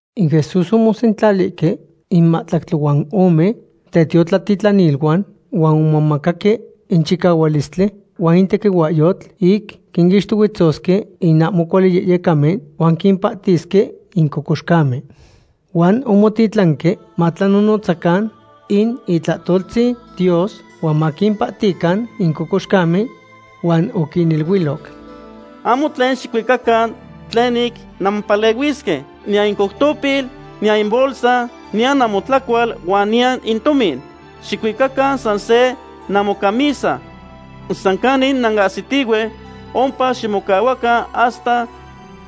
In Jesús omosentlalihque in mahtlactli huan ome tetiotlatitlaniluan huan omomacaque in chicahualistli huan in tequihuahyotl ic quinixtohuetzosque in ahmo cuali yehyecamen huan quimpahtisque in cocoxcamen. Huan omotitlanque matlanonotzacan in itlahtoltzin Dios huan maquimpahtican in cocoxcamen. Huan oquiniluiloc: ―Ahmo tlen xicuicacan tlen ic nanmopalehuisque, niyan in coutopil, niyan in bolsa, niyan namotlacual, huan niyan in tomin. Xicuicacan san se namocamisa. San canin nanahsitihue, ompa ximocahuacan hasta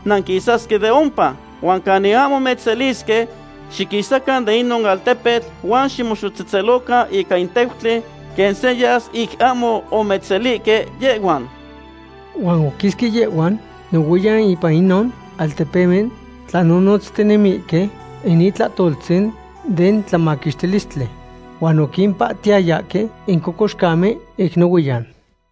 nanquisasque de ompa. Huan canin ahmo mechselisque, xiquisacan de inon altepetl huan ximoxotzetzelocan ica in teutli, quen senyas ic ahmo omechselihque yehhuan. Huan oquisque yehhuan nohuiyan ipan inon altepemen tlanonotztinemihque in itlahtoltzin den tlamaquixtilistli. Huan oquimpahtihtayahque in cocoxcamen ic nohuiyan.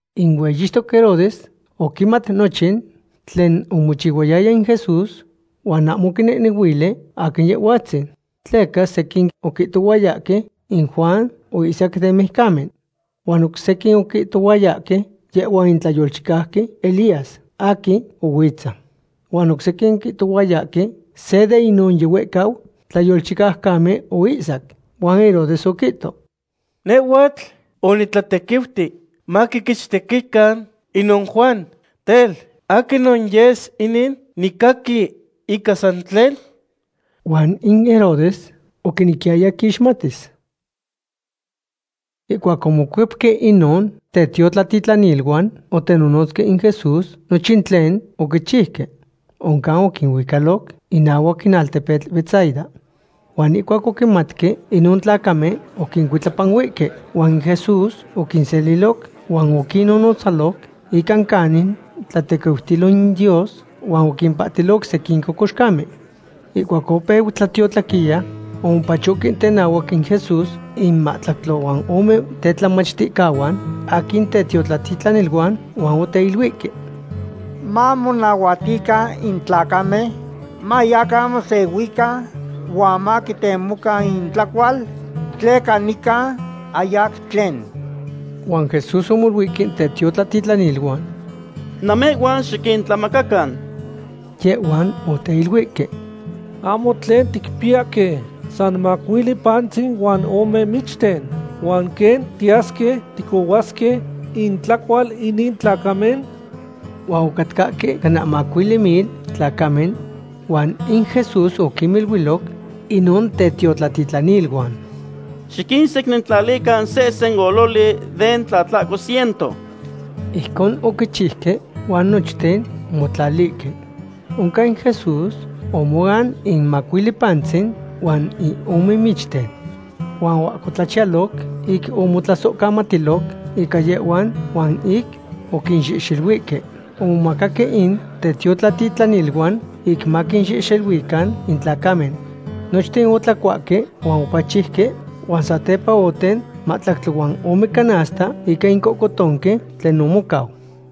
In hueyixtoc Herodes oquimat nochin tlen omochihuayaya in Jesús huan ahmo oquinehnehuili aquin Yehhuatzin. Tleca sequin oquihtohuayahque in Juan oihsac den mijcamen. Huan oc sequin oquihtohuayahque yehhua in tlayolchicauqui Elías aquin ohuitza. Huan oc sequin oquihtohuayahque se de inon yihuehcau tlayolchicaucamen oihsac. Huan Herodes oquihto: ―Nehhuatl onitlatequiuti maquiquechtequican inon Juan. Tel, ¿aquinon yes inin nicaqui ica san tlen? Huan in Herodes oquinequiyaya quixmatis. Ihcuac omocuepque inon tetiotlatitlaniluan otenonotzque in Jesús nochin tlen oquichiuque. Oncan oquinuicaloc inahuac in altepetl Betsaida. Huan ihcuac oquimatque inon tlacamen, oquincuitlapanuihque. Huan in Jesús oquinseliloc huan oquinnonotzaloc ica canin tlatequiutilo in Dios huan oquimpahtiloc sequin cocoxcamen. Ihcuac opeu tlatiotlaquiya, omopachohque tenahuac in Jesús in mahtlactli huan ome tetlamachticahuan aquin tetiotlatitlaniluan huan oteiluihque: ―Mamonahuatican in tlacamen mayacan mosehuican huan maquitemocan intlacual, tleca nican ahyac tlen. Huan Jesús omoluihque tetiotlatitlaniluan: ―Namehhuan xiquintlamacacan. Yehhuan oteiluihque: ―Ahmo tlen ticpiyahque, san macuili pantzin huan ome michten. ¿Huan quen tiyasque ticohuasque intlacual inin tlacamen? Huan ocatcahque cana macuili mil tlacamen. Huan in Jesús oquiniluiloc inon tetiotlatitlaniluan: ―Xiquinsecnintlalican sehsen ololi den tlahtlaco ciento. Ijcon oquichiuque huan nochten omotlalihque. Oncan in Jesús omoan in macuili pantzin huan in ome michten. Huan oahcotlachiyaloc ic omotlasohcamatiloc ica yehhuan huan ic oquinxehxeluihque, omomacaque in tetiotlatitlaniluan ic maquinxehxeluican in tlacamen. Nochten otlacuahque huan opachiuque, huan satepa oten mahtlactli huan ome canasta ica in cohcotonqui tlen omocau.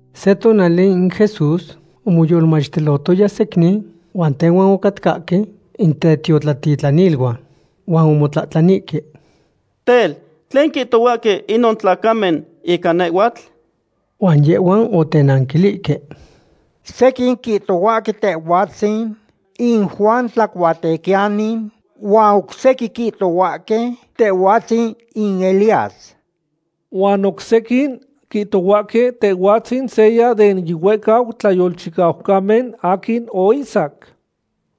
Se tonali in Jesús omoyolmachtilohtoya secnin, huan tehuan ocatcahque in tetiotlatitlaniluan. Huan omotlahtlanihque: ―Tel, ¿tlen quihtohuahque inon tlacamen ica nehhuatl? Huan yehhuan otenanquilihque: ―Sequin quihtohuahque Tehhuatzin in Juan Tlacuatequiyani huan oc sequin quihtohuahque Tehhuatzin in Elías, huan oc sequin quihtohuahque Tehhuatzin seya den yihuehcau tlayolchicaucamen aquin oihsac.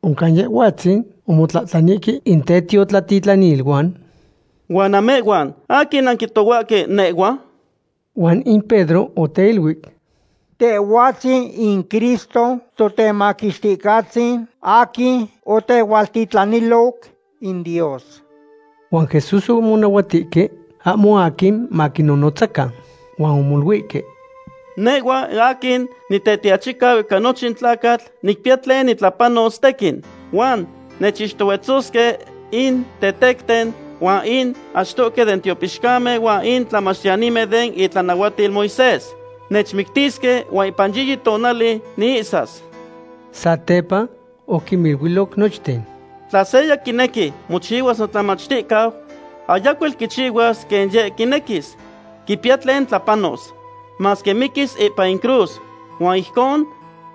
Oncan Yehhuatzin omotlahtlanihque in tetiotlatitlaniluan: ―¿Huan namehhuan, aquin nanquihtohuahque nehhua? Huan in Pedro oteiluic: ―Tehhuatzin in Cristo, Totemaquixticahtzin aquin otehualtitlaniloc in Dios. Huan Jesús omonahuatihque ahmo aquin maquinnonotzacan. Huan omoluihque: ―Nehhua aquin Nitetiachicau ica nochin tlacatl nicpiya tlen nitlapanos tequin, huan nechixtohuetzosque in tetecten, huan in achtohque den tiopixcamen huan in tlamachtiyanimen den itlanahuatil Moisés. Nechmictisque huan ipan yiyi tonali niihsas. Satepa oquiniluiloc nochten: ―Tla seya quinequi mochihua notlamachticau, ayacuel quichihuas quen yeh quinequis. Quipiya tlen tlapanos, masque miquis ipan in cruz, huan ijcon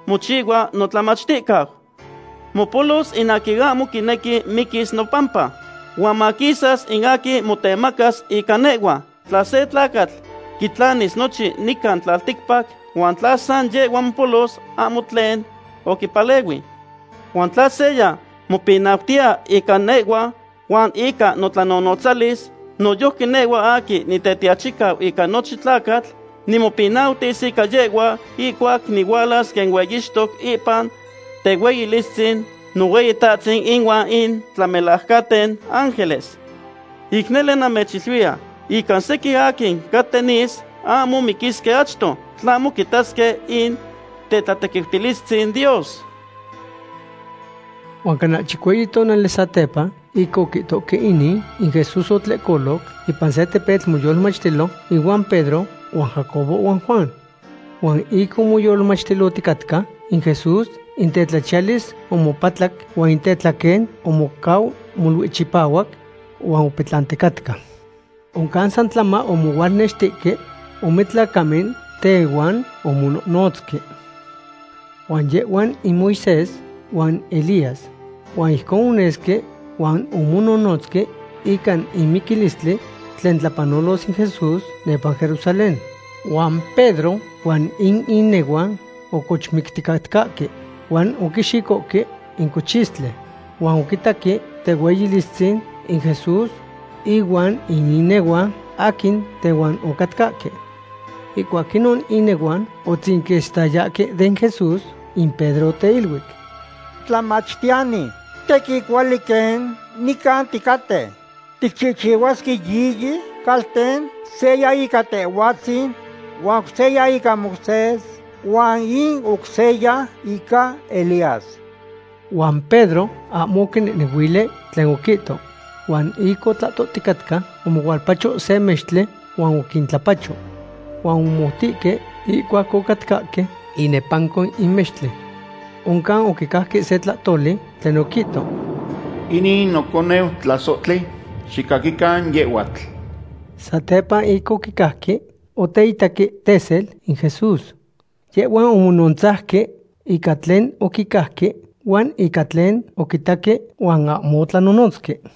mochihua notlamachticau. Mopolos in aquin ahmo quinequi miquis nopampa, huan maquisas in aquin motemacas ica nehhua. Tla se tlacatl quitlanis nochin nican tlalticpac huan tla san yehhua mopolos, ahmo tlen oquipalehui. Huan tla seya mopinautiya ica nehhua huan ica notlanonotzalis, noyojqui nehhua aquin Nitetiachicau ica nochin tlacatl nimopinautis ica yehhua ihcuac nihualas quen hueyixtoc ipan tehueyilistzin Nohueyitahtzin inuan in tlamelajcanten ángeles. Ic nele namechiluiya ica sequin aquin caten nis ahmo miquisque achto, tlahmo quitasque in tetlatequiutilistzin Dios. Huan cana chicueyi tonali satepa ic oquihtohque inin, in Jesús otlehcoloc ipan se tepetl moyolmachtilo ihuan Pedro huan Jacobo huan Juan. Huan ic omoyolmachtilohticatca in Jesús, in tetlachiyalis omopatlac huan in tetlaquen omocau molui chipahuac huan opetlanticatca. Oncan san tlama omohualnextihque ome tlacamen tehuan omonohnotzque. Huan yehhuan in Moisés huan Elías. Huan ijcon onesque huan omonohnotzque ica in miquilistli tlen tlapanolos in Jesús nepa Jerusalén. Huan Pedro huan in inehuan ocochmicticatcahque, huan oquixicohque in cochistli. Huan oquitaque tehueyilistzin in Jesús ihuan in inehuan aquin tehuan ocatcahque. Ihcuac inon inehuan otzinquistayahque den Jesús, in Pedro oteiluic: ―Tlamachtiyani, tequin cuali quen nican ticaten. Tiquinchihuasque yiyi calten, seya ica Tehhuatzin huan oc seya ica Moisés huan in oc seya ica Elías. Huan Pedro ahmo oquinehnehuili tlen oquihto. Huan ic otlahtoticatca omohualpacho se mextli huan oquintlapacho. Huan omomoutihque ihcuac ocatcahque inepanco in mextli. Oncan oquicajque se tlahtoli tlen oquihto: ―Inin in noconeu tlasohtli. Xicaquican yehhuatl. Satepa ic oquicajque, oteitaque tesel in Jesús. Yehhuan omonontzauque ica tlen oquicajque, huan ica tlen oquitaque huan ahmo otlanonotzque.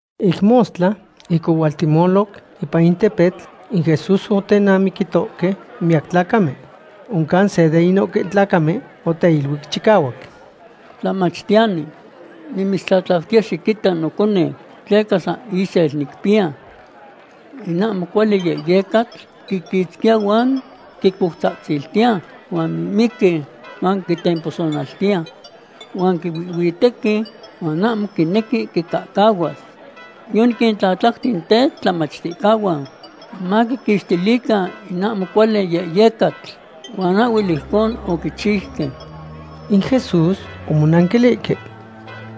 Ic mostla, ic ohualtehtemoloc ipan in tepetl, in Jesús otenamiquitohque miyac tlacamen. Oncan se de inon tlacamen oteiluic chicahuac: ―Tlamachtiyani, nimitztlatlautiya xiquita noconeu, tleca san isel nicpiya. In ahmo cuali yehyecatl quiquitzquiya huan quicoutzatziltiya huan mimiqui huan quitemposonaltiya. Huan quihuihhuitequi huan ahmo quinequi quicahcahuas. Yoniquintlatlauti in tetlamachtihcahuan maquiquixtilican in ahmo cuali yehyecatl huan ahhuel ijcon oquichiuque. In Jesús omonanquilihque: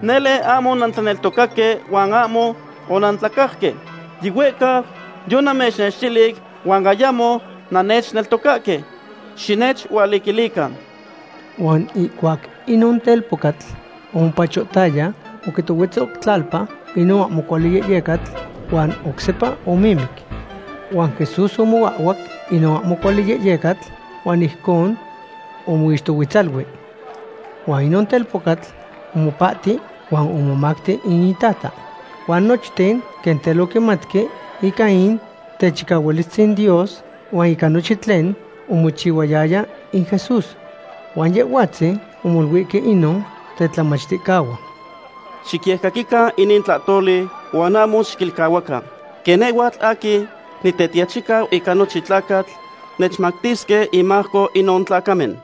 ―Nele ahmo onantlaneltocaque huan ahmo onantlacajque. Yihuehcau yonamechnextilic huan ayamo nannechneltocahque. Xinechualiquilican. Huan ihcuac inon telpocatl omopachohtaya, oquitohuetzo tlalpa inon ahmo cuali yehyecatl, huan oc sepa mamimiqui. Huan Jesús omoahhuac inon ahmo cuali yehyecatl huan ijcon omixtohuetzalui. Huan inon telpocatl omopahti huan omomacti in itata. Huan nochten quen tel oquimatque ica in techicahualistzin Dios, huan ica nochin tlen omochihuayaya in Jesús. Huan Yehhuatzin omoluihque inon tetlamachticahuan: ―Xicyecaquican inin tlahtoli huan ahmo xiquilcahuacan; quen nehhuatl aquin Nitetiachicau ica nochin tlacatl nechtemactisque inmajco inon tlacamen.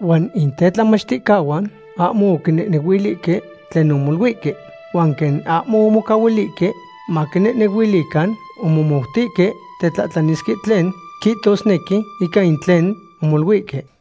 Huan in tetlamachticahuan ahmo oquinehnehuilihque tlen omoluihque. Huan quen ahmo omocahuilihque maquinehnehuilican, omomoutihque tetlahtlanisque tlen quihtosnequi ica in tlen omoluihque.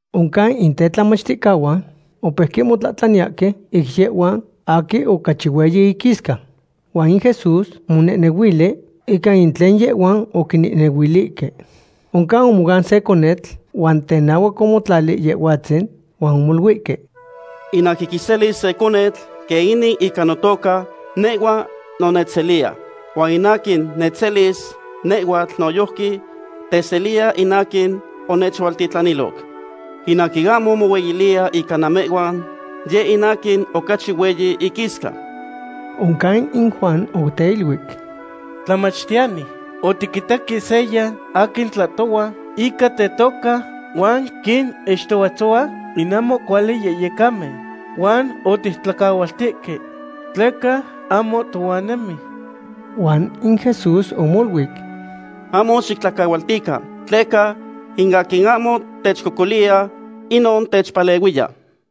Oncan in tetlamachticahuan opeuque motlahtlaniyahque ic yehhuan aquin ocachi hueyi iquisca. Huan in Jesús omonehnehuili ica in tlen yehhuan oquinenehuilihque. Oncan omoan se conetl huan tenahuac omotlali Yehhuatzin, huan omoluihque: ―In aquin quiselis se conetl quen inin ica notoca, nehhua no nechseliya. Huan in aquin nechselis nehhuatl noyojqui teseliya in aquin onechualtitlaniloc. In aquin ahmo mohueyiliya ica namehhuan yeh in aquin ocachi hueyi iquisca. Oncan in Juan oteiluic: ―Tlamachtiyani, otiquitaque seya aquin tlahtohua ica tetoca huan quinixtohuetzohua in ahmo cuali yehyecamen, huan otictlacahualtihque tleca ahmo tohuan nemi. Huan in Jesús omoluic: ―Ahmo xictlacahualtican, tleca in aquin ahmo techcocoliya, inon techpalehuiya.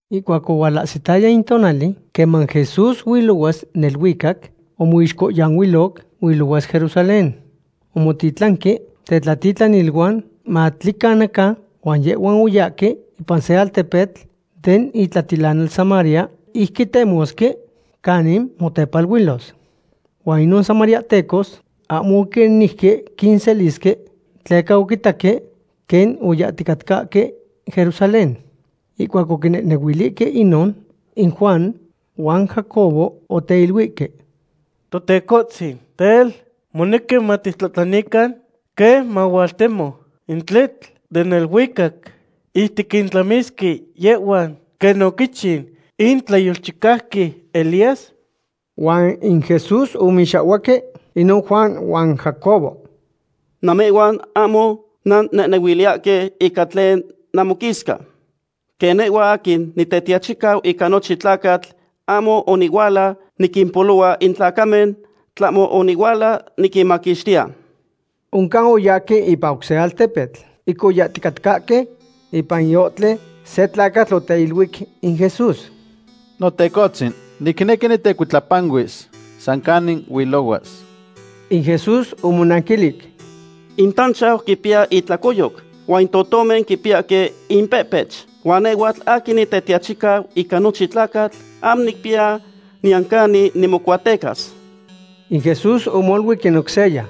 Ihcuac ohualahsitaya in tonali queman Jesús huilohuas neluicac, omixcohyanuiloc huilohuas Jerusalén. Omotitlanqui tetlatitlaniluan matlicanacan, huan yehhuan oyahque ipan se altepetl den itlatilanal Samaria ic quitemosque canin motepaluilos. Huan inon samariahtecos ahmo oquinejque quinselisque tleca oquitaque quen oyahticatcahque Jerusalén. Ihcuac oquinehnehuilihque inon, in Juan huan Jacobo oteiluihque: ―Totecohtzin, tel, ¿monequi matictlahtlanican quen mahualtemo in tletl den neluicac ic tiquintlamisque yehhuan quen oquichiu in tlayolchicauqui Elías? Huan in Jesús omixahhuaque inon Juan huan Jacobo: ―Namehhuan ahmo nannehnehuiliyahque ica tlen namoquisca. Quen nehhua aquin Nitetiachicau ica nochin tlacatl ahmo onihuala niquimpolohua in tlacamen, tlahmo onihuala niquinmaquixtiya. Oncan oyahque ipan oc se altepetl. Ic oyahticatcahque ipan in ohtli, se tlacatl oteiluic in Jesús: ―Notecohtzin, nicnequi nitecuitlapanuis san canin huilohuas. In Jesús omonanquilic: ―In tanchau quipiya itlacoyoc huan in totomen quipiyahque impehpech, huan nehhuatl aquin Nitetiachicau ica nochin tlacatl ahmo nicpiya niyan canin nimocuatecas. In Jesús omoluic in oc seya: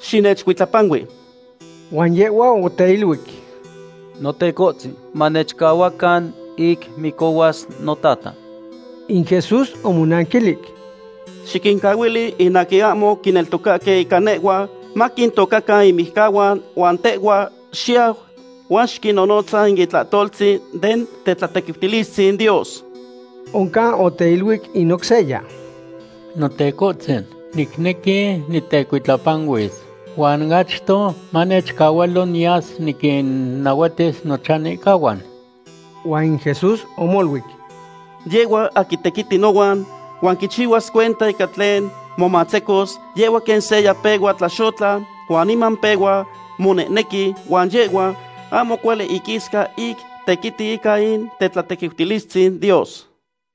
―Xinechcuitlapanui. Huan yehhua oteiluic: ―Notecohtzin, manechcahuacan ic micohuas notata. In Jesús omonanquilic: ―Xiquincahuili in aquin ahmo quineltocahque ica nehhua maquintocacan inmijcahuan huan tehhua xiyau huan xiquinnonotza in itlahtoltzin den tetlatequiutilistzin Dios. Oncan oteiluic in oc seya: ―Notecohtzin, nicnequi nitecuitlapanuis, huan achto manechcahualo niyas niquinnahuatis nochanihcahuan. Huan in Jesús omoluic: ―Yehhua aquin tequiti nohuan huan quichihuas cuenta ica tlen momatzecos, yehhua quen seya pehua tlaxotla huan niman pehua monehnequi, huan yehhua ahmo cuali iquisca ic tequiti ica in tetlatequiutilistzin Dios.